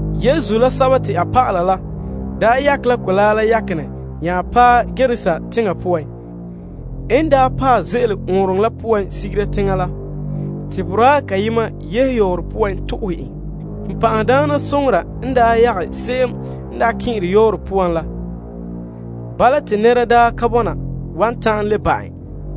Yesu la a dɔlɔba la daa yakɛ la mɔgɔrɛ la yakenɛ nya paɛ Gerasa teŋa poan. En paɛ ze'ele ɔɔnrɔŋɔ la poan sigera teŋa, te boraa kayema yehe yɔɔren to'ohɛ en. Bonbe'a n yagɛ se'em n kɛn'ɛre yɔɔren la, te nɛra daa ka bɔna wan ta'an le ba' en.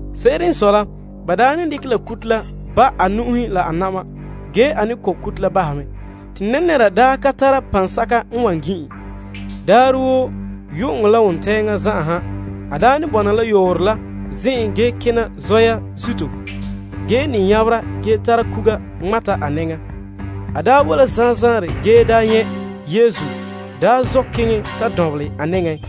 Se'ere n sɔe la, ba daa ne dekɛ la kuto la ba' a nu'uhe la a na'ma ge a ne kɔ' kuto la bahɛ mɛ, te nɛnɛra daa ka tara paŋsɛka n wan gin' en. Daarɛ woo yu'uŋɔ la wontɛɛŋa zan'an, a ne bɔna la yɔɔren ge zona zɔya zuto ge me nyabera ge tara kuga ŋmata a mɛŋa. En boe la zanzaarɛ ge nyɛ' Yesu, te a zɔ' keŋɛ ta lu' a nɛŋan.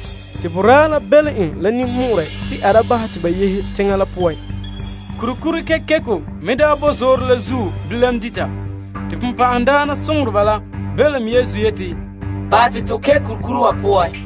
Te a la belom Yesu la ninmɔ'ɔrɛ te a da bahɛ te ba yehe teŋa la poan. Kurikuri kekeko n daa bo zoore la zuo bilam dita, te bonbɛ'ɛhe la belom Yesu yeti, Bahɛ te to kɛn' kurikuri wa poan.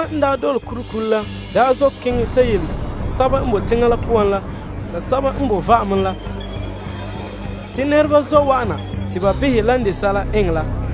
Sɛba n daa dole kurikuri la zɔ' keŋɛ ta yele sɛba n boe teŋa la poan la, la sɛba n bo va'ame la, te nɛreba zɔ' wa'ana te ba behɛ lan de sɛla eŋɛ la.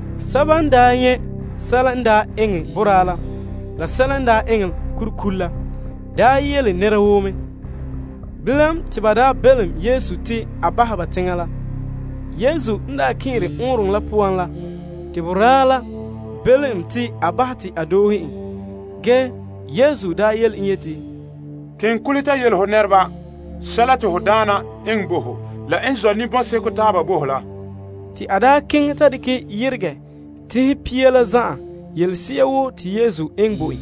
Sɛba n nyɛ' sɛla n daa eŋɛ boraa la, la sɛla n daa eŋɛ kurikuri la, yele nɛra woo mɛ. Bilam, te nɛreba la belom Yesu te a bahɛ ba teŋa la. Yesu n kɛn'ɛre ɔɔnrɔŋɔ la poan la te boraa la belom en te a bahɛ te a doohe en. Yesu ka sakɛ ge yele en yeti, Kule ta yele ho nɛreba sɛla te ho Daana la eŋɛ bo ho, la n zɔ' ninbɔn'seko taaba bo ho la. Te a keŋɛ ta dekɛ yeregɛ Teŋhe Pia la zan'an yelese'a woo te Yesu enŋ bo en.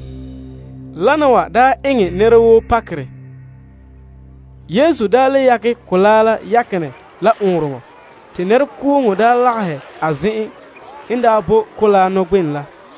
Wana wa eŋɛ nɛra woo pakerɛ. Yesu daa le yakɛ la mɔgɔrɛ la yakenɛ la ɔɔnrɔŋɔ, te nɛrekooŋɔ lagahɛ a zen'en n boe mɔgɔrɛ nɔgbenɛ la.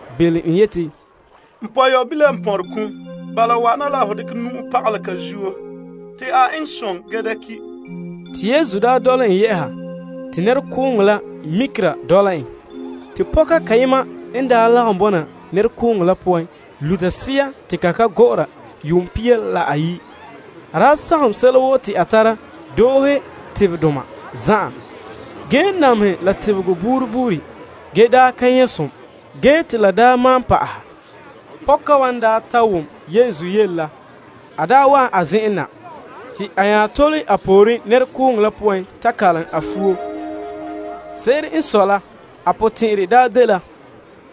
belom en yeti, N pɔyɔbila n pɔnre kum, bala wa'ana la ho dekɛ ho nu'uhe pagalɛ a zuo te a eŋɛ som gee da ki'. Te Yesu dɔla en yɛ'a. Te nɛrekooŋɔ la dɔla mikera en. Ge pɔka kayema n daa lagom bɔna nɛrekooŋɔ la poan luta sea ge te la ka gɔ'ɔra yuum pia la ayi'. A daa sagom sɛla woo te a tara, doohe tebedoma zan'an, ge namehɛ la tebegɔ buuri buuri ge daa ka nyɛ' som, ge te la daa malom pa'ahɛ. Pɔka wa n ta wom Yesu yele la, a wa'an a zen'an na. Te a nya tole a pooren nɛrekooŋɔ la poan ta kalom a fuo. Se'ere n sɔe la a potɛn'ɛrɛ dela,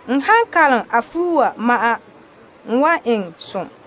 N han kalom a fuo wa ma'an, n wan eŋɛ som.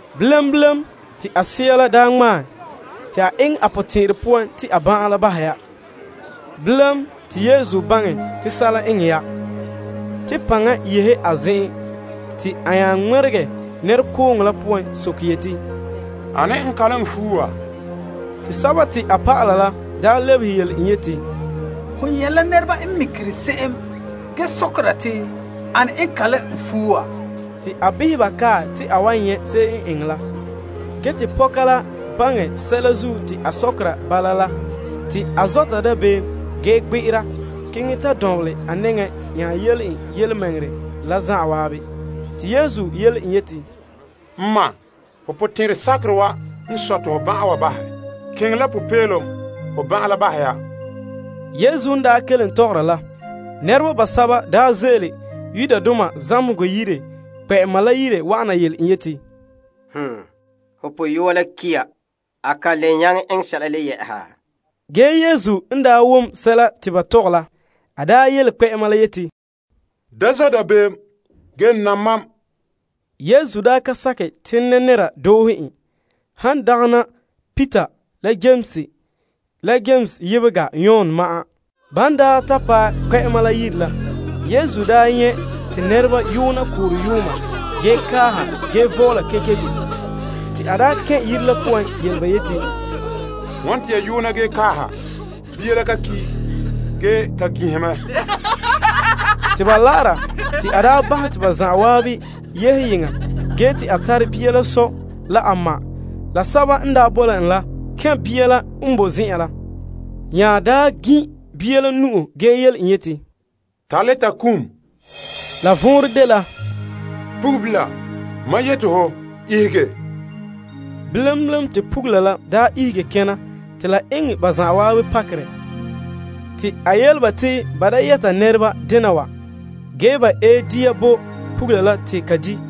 Bilam bilam, te a sea la daa ŋmaɛ la, te a baŋɛ te a ban'an la bahɛ ya. Bilam, te Yesu baŋɛ te sɛla eŋɛ ya te paŋa yehe a zen'en nya ŋmɛregɛ nɛrekooŋɔ la poan soke yeti, Ane n kalom n fuo wa? Te a dɔlɔba la lebehe en yeti, Ho nyɛ' la nɛreba n mikera se'em ge sɔkera te, Ane n kalom n fuo wa? Te a behɛ ba kae te a wan nyɛ' se'em n eŋɛ la. Ge te pɔka la baŋɛ sɛla zuo te a sɔkera bala la te a zɔta dabeem ge gbe'era keŋɛ ta dɔnbelɛ a nɛŋa nya yele en yelemɛŋɛrɛ la zan'an. Te Yesu yele en yeti, N ma, ho potɛn'ɛrɛ sakerɛ wa n sɔe te ho ban'an wa bahɛ. Keŋɛ la popeelom. Ho ban'an la bahɛ ya. Yesu n daa kelen tɔgɔra la, nɛreba basɛba daa ze'ele Yairus zamehegɔ yire kpɛ'ɛma la yire wa'ana yele en yeti, Ho pɔyɔa la ki' ya. A kan le nyaŋɛ eŋɛ sɛla le yɛ'ɛha? Yesu wom sɛla te ba tɔgɛ la, ge te a yele kpɛ'ɛma la yeti, Da zɔ' dabeem, ge nam mam. Yesu ka sakɛ te nɛnɛra doohe en, han dagɛna Peter la Yames, la Yames yebega Yon ma'an. Ban ta paɛ kpɛ'ɛma la yire la, Yesu nyɛ' te nɛreba yoona koorɛ yooma ge kaaha ge vɔɔla kekeko. A kɛn' yire la poan soke ba yeti, Wane te ya yoona ge kaaha? Bia la ka ki', ge ka ginhɛ mɛ. Ge ba la'ara, te a bahɛ te ba zan'an yehe yeŋa ge te a tare bia la sɔ la a ma la sɛba n boe la en la kɛn' bia la n boe zen'an la. A nya gin' bia la nu'o ge yele en yeti, Talita kumi. La vɔnrɛ dela, Pugula, mam yeti ho, ihege. Bilam bilam te pugula la ihege kena te la eŋɛ ba zan'an pakerɛ. Pugula la daa dela yuun pia la ayi'. Te a yele ba te ba da yɛta nɛreba dena wa ge ta ɛ dia bo pugula la te ka di'.